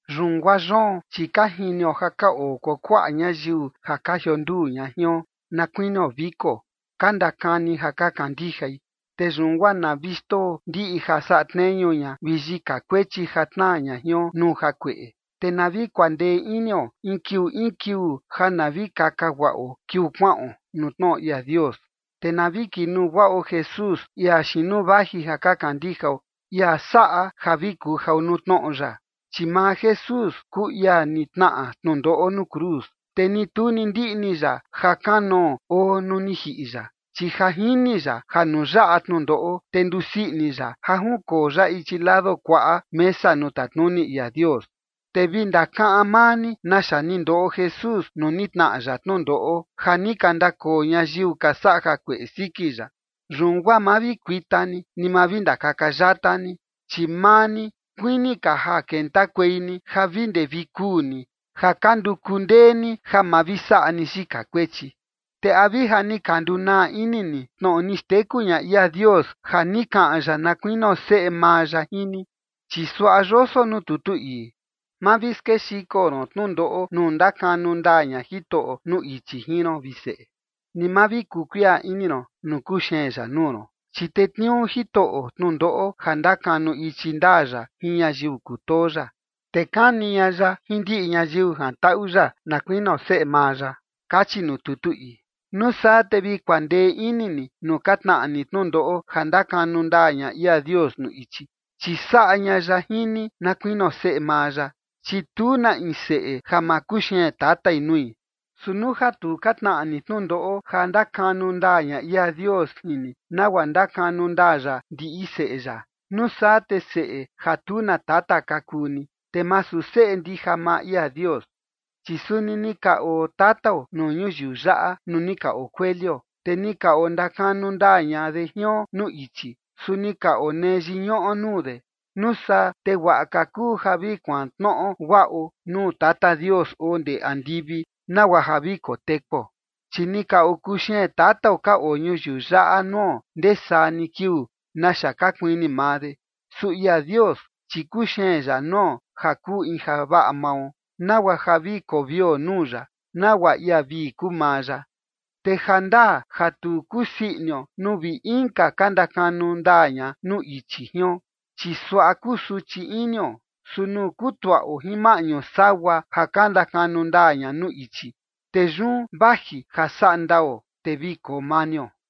Yun guaa yoon, chi ka jinio ja ka oo kuakuaꞌa ñayiu ja ka jionduu ña jion na kuinio viko, ka ndakani ja ka kandijai. Te yun guaa na vi xndoo ndiꞌi ja saꞌa tneñu ña vi yika kuechi ja tnaa ña jion nuu jakueꞌe, te na vi kuandee inio in kiuu in kiuu ja na vi kaka guaꞌo kiuu kuaꞌon nuu tnoꞌo ia Dios. Te na vi kinuu guaꞌo Jesús, ia xiin nuu vaji ja ka kandijao, ia saꞌa ja vi kujao nuu tnoꞌo ya. Chi maa Jesús kuu ia ni tnaꞌa tnundoꞌo nuu cruz, te ni tu ni ndiꞌni ya ja kanoo oo nuu ni jiꞌi ya, chi ja jini ya ja nuu yaꞌa tnundoꞌo, te ndusii ini ya ja junkoo ya ichi lado kuaꞌa mesa nuu tatnuni ia Dios. Te vi ndakaꞌan maa ni naxa ni ndoꞌo Jesús nuu ni tnaꞌa ya tnundoꞌo, ja ni ka ndakoo ñayiu ka saꞌa jakueꞌe siki ya. Yun guaa ma vi kuita ni, ni ma vi ndakaka yata ni. Chi maa ni, kuini ka ja kentakuei ni ja vi ndee vi kuu ni ja ka nduku ndee ni ja ma vi saꞌa ni yika kuechi. Te ¿a vi ja ni ka ndunaa ini ni tnoꞌo ni xteku ña ia Dios ja ni kaꞌan ya na kuinio seꞌe maa ya jin ni? Chi suaꞌa yoso nuu tutu ii: Ma vi skexiko ron tnundoꞌo nuu ndakanu ndaa ña Jitoꞌo nuu ichi jin ron, vi seꞌe, ni ma vi kuu kuiꞌa ini ron nuu kuxeen ya nuu ron. Chi tetniuu Jitoꞌo tnundoꞌo ja ndakanu ichi ndaa ya jin ñayiu kutoo ya, te kani ña ya jin ndiꞌi ñayiu jantaꞌu ya, na kuinio seꞌe maa ya, kachi nuu tutu ii. Nuu saa te vi kuandee ini ni nuu ka tnaꞌa ni tnundoꞌo ja ndakanu ndaa ña ia Dios nuu ichi, chi saꞌa ña ya jin ni na kuinio seꞌe maa ya, chi tu na in seꞌe ja ma kuxeen tatai nui. Su nuu ja tu ka tnaꞌa ni tnundoꞌo ja ndakanu ndaa ña ia Dios jin ni, nagua ndakanu ndaa ya ndiꞌi seꞌe ya, nuu saa te seꞌe ja tu na tata ka kuu ni, te masu seꞌe ndija maa ia Dios. Chi suni ni ka oo tatao nuu ñuyiu yaꞌa nuu ni ka okuelio, te ni ka ondakanu ndaa ña de jion nuu ichi, su ni ka onee yiñuꞌo nuu de. Nuu saa te guaꞌa ka kuu ja vi kuantnoꞌo guaꞌo nuu Tata Dios oo ndee andivi nagua ja vi kotekuo. Chi ni ka okuxeen tatao ka oo ñuyiu yaꞌa nuo ndee saa ni kiuu, naxa ka kuini maa de. Su ia Dios, chi kuxeen ya nuo ja kuu in javaꞌa mao, nagua ja vi kovio nuu ya, nagua ia vii kuu maa ya. Te ja ndaa ja tu kusii inio nuu vi inka ka ndakanu ndaa ña nuu ichi jion, chi suaꞌa kusuchi inio. Su nuu kutuaꞌo jin maꞌñu sagua ja ka ndakanu ndaa ña nuu ichi, te yun vaji ja vi saꞌa ndao, te vi koo manio.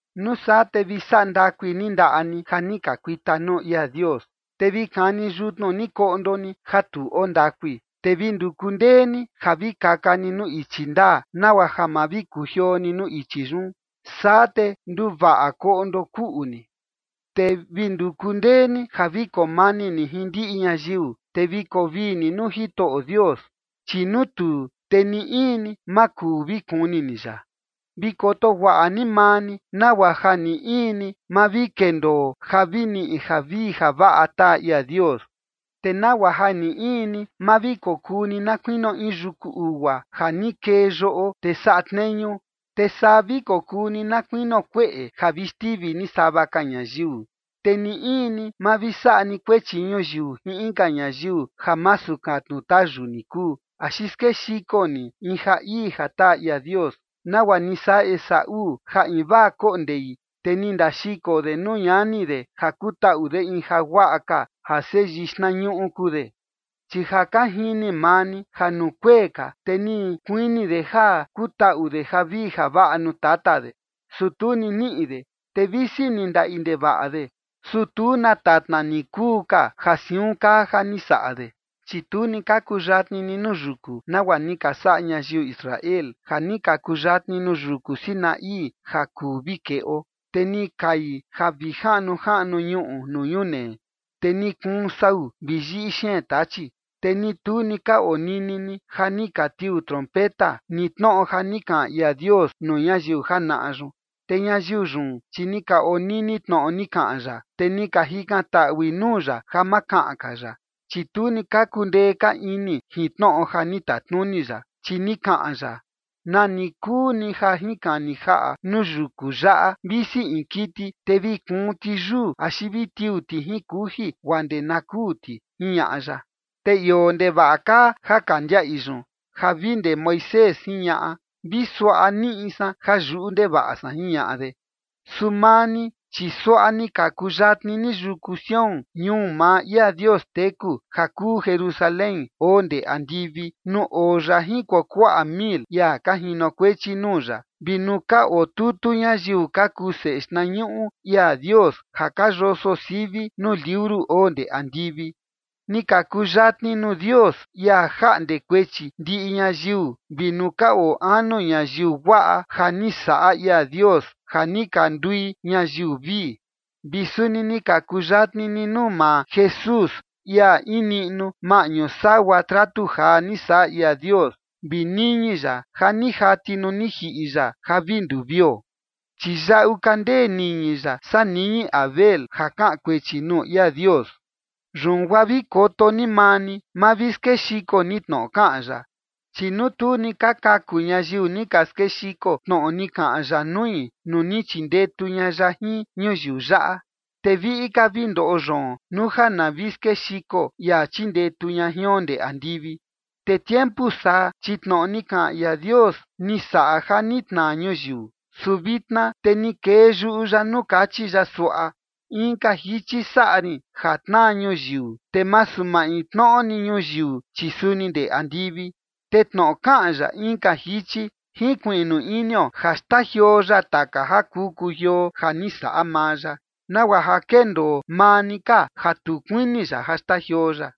Nuu saa te vi saꞌa ndakui ni ndaꞌa ni ja ni ka kuita nuu ia Dios. Te vi kani yutnu ni koꞌndo ni ja tu oo ndakui. Te vi nduku ndee ni ja vi kaka ni nuu ichi ndaa, nagua ja ma vi kujioo ni nuu ichi yun. Saa te nduvaꞌa koꞌndo kuꞌu ni. Te vi nduku ndee ni ja vi koo mani ni jin ndiꞌi ñayiu, te vi koo vii ni nuu Jitoꞌo Dios. Chi nuu tuu, te ni in ni, ma kuu vi kuni ni ya. Vi koto guaꞌa ni maa ni nagua ja ni in ni ma vi kendoo ja vi niꞌi javii javaꞌa taa ia Dios, te nagua ja ni in ni ma vi kokuu ni na kuinio in yuku ugua ja ni kee yoꞌo, te saꞌa tneñu, te saa vi kokuu ni na kuinio kueꞌe ja vi xtivi ni sava ka ñayiu. Te ni in ni ma vi saꞌa ni kuechi ñuyiu jin inka ñayiu ja masu katnu tayu ni kuu, axi skexiko ni in ja ii ja taa ia Dios, nagua ni saꞌa Esaú ja invaa koꞌo ndei, te ni ndaxiko de nuu ñani de ja kutaꞌu de in jaguaꞌa ka ja seyii xtnañuꞌu kuu de. Chi ja ka jini maa ni ja nuu kuee ka, te ni kuini de ja kutaꞌu de javii javaꞌa nuu tata de, su tu ni niꞌi de. Te visi ni ndaꞌi ndevaꞌa de, su tu na tatna ni kuu ka ja siun kaa ja ni saꞌa de. Chi tu ni ka kuyatni ni nuu yuku, nagua ni ka saꞌa ñayiu Israel ja ni ka kuyatni nuu yuku Sinaí ja kuu vi keꞌo. Te ni kai ja vi jaꞌnu jaꞌnu ñuꞌu nuu ñunee, te ni kuun sau vi yiꞌi xeen tachi. Te ni tu ni ka onini ni ja ni ka tiuu trompeta, ni tnoꞌo ja ni kaꞌan ia Dios nuu ñayiu janaꞌa yun. Te ñayiu yun, chi ni ka onini tnoꞌo ni kaꞌan ya, te ni ka jikantaꞌui nuu ya ja ma kaꞌan ka ya. Chi tu ni ka kundee ka ini jin tnoꞌo ja ni tatnuni ya, chi ni kaꞌan ya: “Na ni kuu ni ja jinkani jaꞌa nuu yuku yaꞌa, visi in kiti, te vi kuun ti yuu axi vi tiuu ti jin kuji guaa ndee na kuu ti”, jiñaꞌa ya. Te ioo ndevaꞌa kaa ja ka ndiaꞌi yun ja vi ndee Moisés jiñaꞌa: “Vi suaꞌa niꞌi san ja yuꞌu ndevaꞌa san”, jiñaꞌa de. Su maa ni, chi suaꞌa ni ka kuyatni ni yuku Sión, ñuu maa ia Dios teku, ja kuu Jerusalén oo ndee andivi nuu oo ya jin kuakuaꞌa mil ia ka jinokuechi nuu ya, vi nuu ka otutu ñayiu ka kuu seꞌe xtnañuꞌu ia Dios ja ka yoso sivi nuu liuru oo ndee andivi. Ni ka kuyatni nuu Dios, ia jaꞌnde kuechi ndiꞌi ñayiu vi nuu ka oo anu ñayiu guaꞌa ja ni saꞌa ia Dios ja ni ka ndui ñayiu vii. Vi suni ni ka kuyatni ni nuu maa Jesús, ia in niꞌnu maꞌñu sagua tratu jaa ni saꞌa ia Dios, vi niñi ya ja ni jati nuu ni jiꞌi ya ja vi nduu vio. Chi yaꞌu ka ndee niñi ya saa niñi Abel ja kaꞌan kuechi nuu ia Dios. Yun guaa vi koto ni maa ni, ma vi skexiko ni tnoꞌo kaꞌan ya. Chi nuu tu ni ka kaku ñayiu ni ka skexiko tnoꞌo ni kaꞌan ya nui nuu ni chindetu ña ya jin ñuyiu yaꞌa, te viꞌi ka vi ndoꞌo yoon, nuu ja na vi skexiko ia chindetu ña jion ndee andivi. Te tiempu saa, chi tnoꞌo ni kaꞌan ia Dios ni saꞌa ja ni tnaa ñuyiu. Su vitna te ni kee yuꞌu ya nuu kachi ya suaꞌa: “Inka jichi saꞌa rin ja tnaa ñuyiu, te masu maintnoꞌo ni ñuyiu, chi suni ndee andivi”. Te tnoꞌo kaꞌan ya “inka jichi”, jinkuiꞌnu inio ja xtajioo ya taka ja kuu kujioo ja ni saꞌa maa ya, nagua ja kendoo maa ni ka ja tu kuini ya ja xtajioo ya.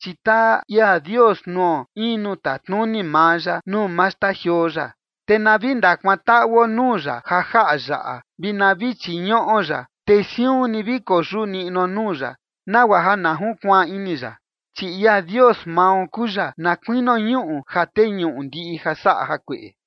Chi taa ia Dios nuo in nuu tatnuni maa ya nuu ma xtajioo ya. Te na vi ndakuantaꞌuo nuu ya ja jaꞌa yaꞌa, vi na vi chiñuꞌo ya, te siun ni vi koyuꞌu niꞌnuo nuu ya, nagua ja na junkuaan ini ya. Chi ia Dios mao kuu ya na kuinio ñuꞌu ja teñuꞌu ndiꞌi ja saꞌa jakueꞌe.